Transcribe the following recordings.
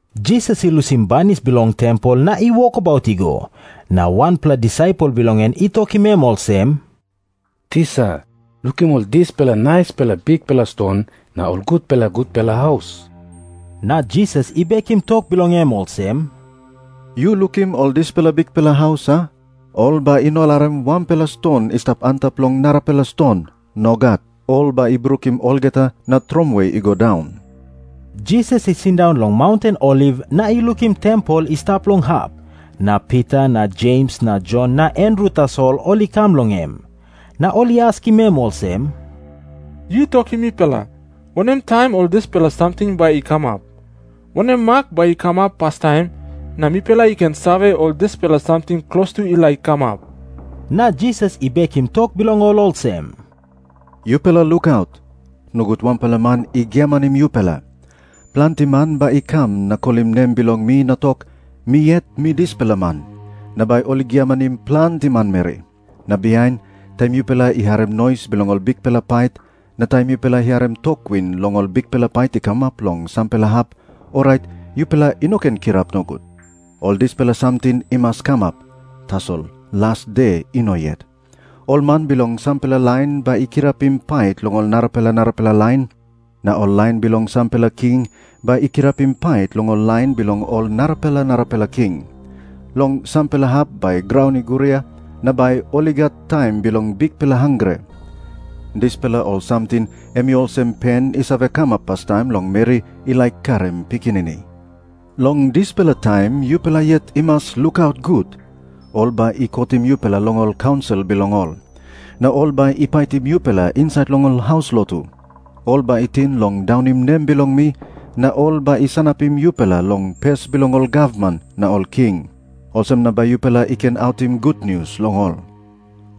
Jisas i lusim banis bilong tempel na i wokabaut i go, na wanpela disaipel bilong en i tokim em olsem, “Tisa, lukim ol dispela naispela bikpela ston na ol gutpela gutpela haus!” Na Jisas i bekim tok bilong em olsem, “Yu lukim ol dispela bikpela haus, a? Ol bai i no larim wanpela ston i stap antap long narapela ston. Nogat. Ol bai i brukim olgeta na tromoi i go daun.” Jisas i sindaun long maunten Oliv na i lukim tempel i stap long hap. Na Pita na Jems na Jon na Andru tasol ol i kam long em. Na ol i askim em olsem, “Yu tokim mipela, wanem taim ol dispela samting bai i kamap? Wanem mak bai i kamap pastaim, na mipela i ken save, ol dispela samting klostu i laik kamap?” Na Jisas i bekim tok bilong ol olsem, “Yupela lukaut. Nogut wanpela man i giamanim yupela. Planti man bai i kam na kolim nem bilong mi na tok, ‘Mi yet mi dispela man.’ Na bai ol i giamanim planti manmeri. “Na bihain, taim yupela i harim nois bilong ol bikpela pait, na taim yupela i harim tok win long ol bikpela pait i kamap long sampela hap, orait yupela i no ken kirap nogut. Ol dispela samting i mas kamap, tasol las de i no yet. Ol man bilong sampela lain bai i kirapim pait long ol narapela narapela lain. Na ol lain bilong sampela king bai i kirapim pait long ol lain bilong ol narapela narapela king. Long sampela hap bai graun i guria, na bai ol i gat taim bilong bikpela hangre. Dispela ol samting em i olsem pen i save kamap pastaim long meri i laik karim pikinini. “Long dispela taim yupela yet i mas lukaut gut. Ol bai i kotim yupela long ol kaunsil bilong ol. Na ol bai i paitim yupela insait long ol haus lotu. Ol bai i ting long daunim nem bilong mi, na ol bai i sanapim yupela long pes bilong ol gavman na ol king. Olsem na bai yupela i ken autim gutnius long ol.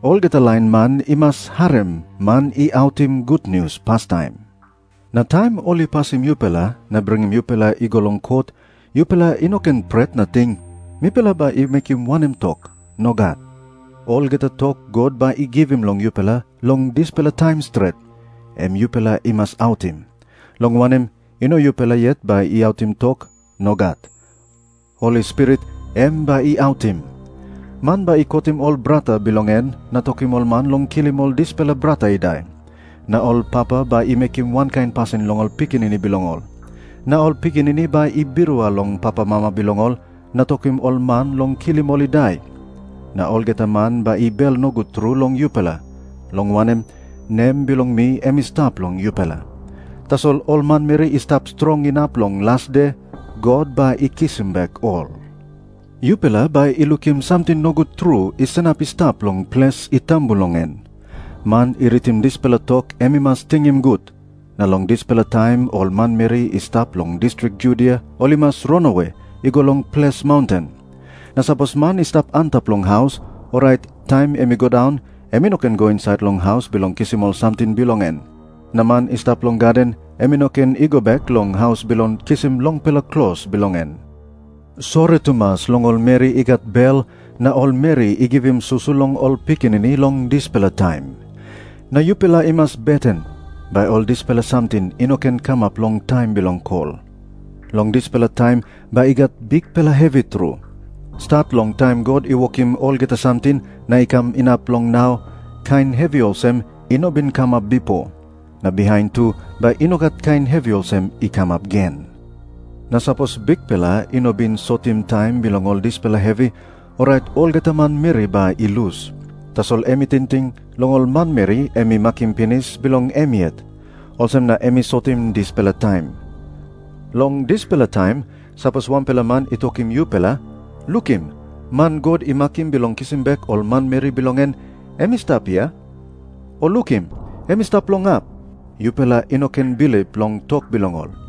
Olgeta lain man i mas harim man i autim gutnius pastaim. Na taim ol i pasim yupela na bringim yupela i go long kot, yupela i no ken pret na ting, ‘Mipela bai i mekim wanem tok?’ Nogat. Olgeta tok God bai i givim long yupela long dispela taim stret, em yupela i mas autim. Long wanem, i no yupela yet bai i autim tok. Nogat. Holi Spirit em bai i autim. Man bai i kotim ol brata bilong en na tokim ol man long kilim ol dispela brata i dai. Na ol papa bai i mekim wankain pasin long ol pikinini bilong ol. Na ol pikinini bai i birua long papamama bilong ol na tokim ol man long kilim ol i dai. Na olgeta man bai i bel nogut tru long yupela, long wanem, nem bilong mi em i stap long yupela. Tasol ol manmeri i stap strong inap long las de, God bai i kisim bek ol.” Jisas i tok moa olsem, “Yupela bai i lukim samting nogut tru i sanap i stap long ples i tambu long en.” Man i ritim dispela tok em i mas tingim gut. “Na long dispela taim ol manmeri i stap long distrik Judia ol i mas ranawe i go long ples maunten. Na sapos man i stap antap long haus, orait taim em i go daun em i no ken i go insait long haus bilong kisim ol samting bilong en. Na man i stap long gaden, em i no ken i go bek long haus bilong kisim longpela klos bilong en. Sori tumas long ol meri i gat bel na ol meri i givim susu long ol pikinini long dispela taim. Na yupela i mas beten, bai ol dispela samting i no ken kamap long taim bilong kol. Long dispela taim bai i gat bikpela hevi tru. Stat long taim God i wokim olgeta samting na i kam inap long nau, kain hevi olsem i no bin kamap bipo. Na bihain tu bai i no gat kain hevi olsem i kamap gen. Na sapos Bikpela i no bin sotim taim bilong ol dispela hevi, orait olgeta manmeri bai i lus. Tasol em i tingting long ol manmeri em i makim pinis bilong em yet. Olsem na em i sotim dispela taim. “Long dispela taim, sapos wanpela man i tokim yupela, ‘Lukim, man God i makim bilong kisim bek ol manmeri bilong en, em i stap hia,’ o ‘Lukim, em i stap long hap,’ yupela i no ken bilip long tok bilong ol.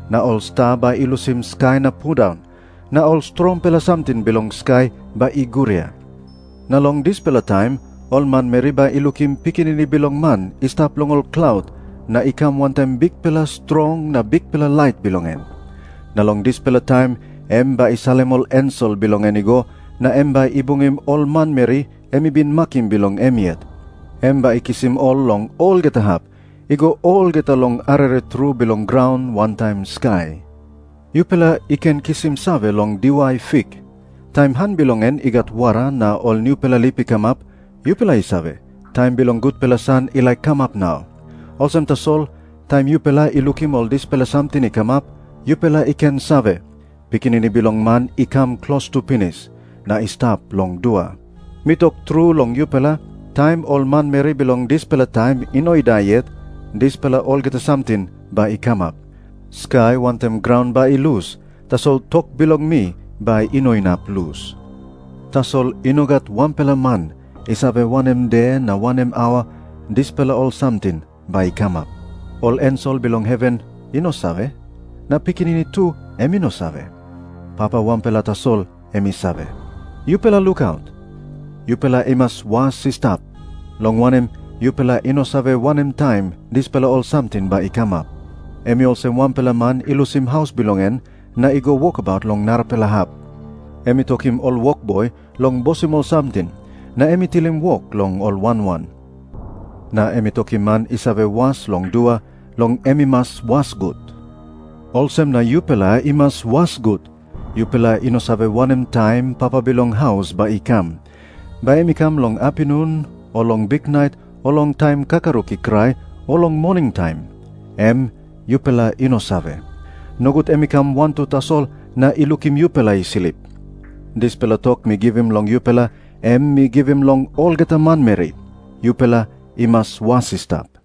na ol sta bai i lusim skai na pundaun, na ol strongpela samting bilong skai bai i guria. Na long dispela taim ol manmeri bai i lukim Pikinini Bilong Man i stap long ol klaut na i kam wantaim bikpela strong na bikpela lait bilong en. Na long dispela taim em bai i salim ol ensel bilong en i go, na em bai i bungim ol manmeri em i bin makim bilong em yet. Em bai i kisim ol long olgeta hap, i go olgeta long arere tru bilong graun wantaim skai.” Jisas i tok moa olsem, “Yupela i ken kisim save long diwai fik. Taim han bilong en i gat wara na ol nupela lip i kamap, yupela i save, taim bilong gutpela san i laik kamap nau. Olsem tasol, taim yupela i lukim ol dispela samting i kamap, yupela i ken save, Pikinini Bilong Man i kam klostu pinis, na i stap long dua. Mi tok tru long yupela, taim ol manmeri bilong dispela taim i no i dai yet, dispela olgeta samting bai i kamap. Skai wantaim graun bai i lus, tasol tok bilong mi bai i no inap lus.” Jisas i tok moa olsem, “Tasol i no gat wanpela man i save wanem de na wanem aua dispela ol samting bai i kamap. Ol ensel bilong heven i no save, na Pikinini tu em i no save. Papa wanpela tasol em i save. “Yupela lukaut. Yupela i mas was i stap, long wanem, yupela i no save wanem taim dispela ol samting bai i kamap. Em i olsem wanpela man i lusim haus bilong en na i go wokabaut long narapela hap. Em i tokim ol wokboi long bosim ol samting, na em i tilim wok long ol wan wan. Na em i tokim man i save was long dua long em i mas was gut. Olsem na yupela i mas was gut. Yupela i no save wanem taim papa bilong haus bai i kam. Bai em i kam long apinun o long biknait o long taim kakaruk i krai o long moningtaim, em yupela i no save. Nogut em i kam wantu tasol na i lukim yupela i slip. Dispela tok mi givim long yupela, em mi givim long olgeta manmeri. Yupela i mas was i stap.”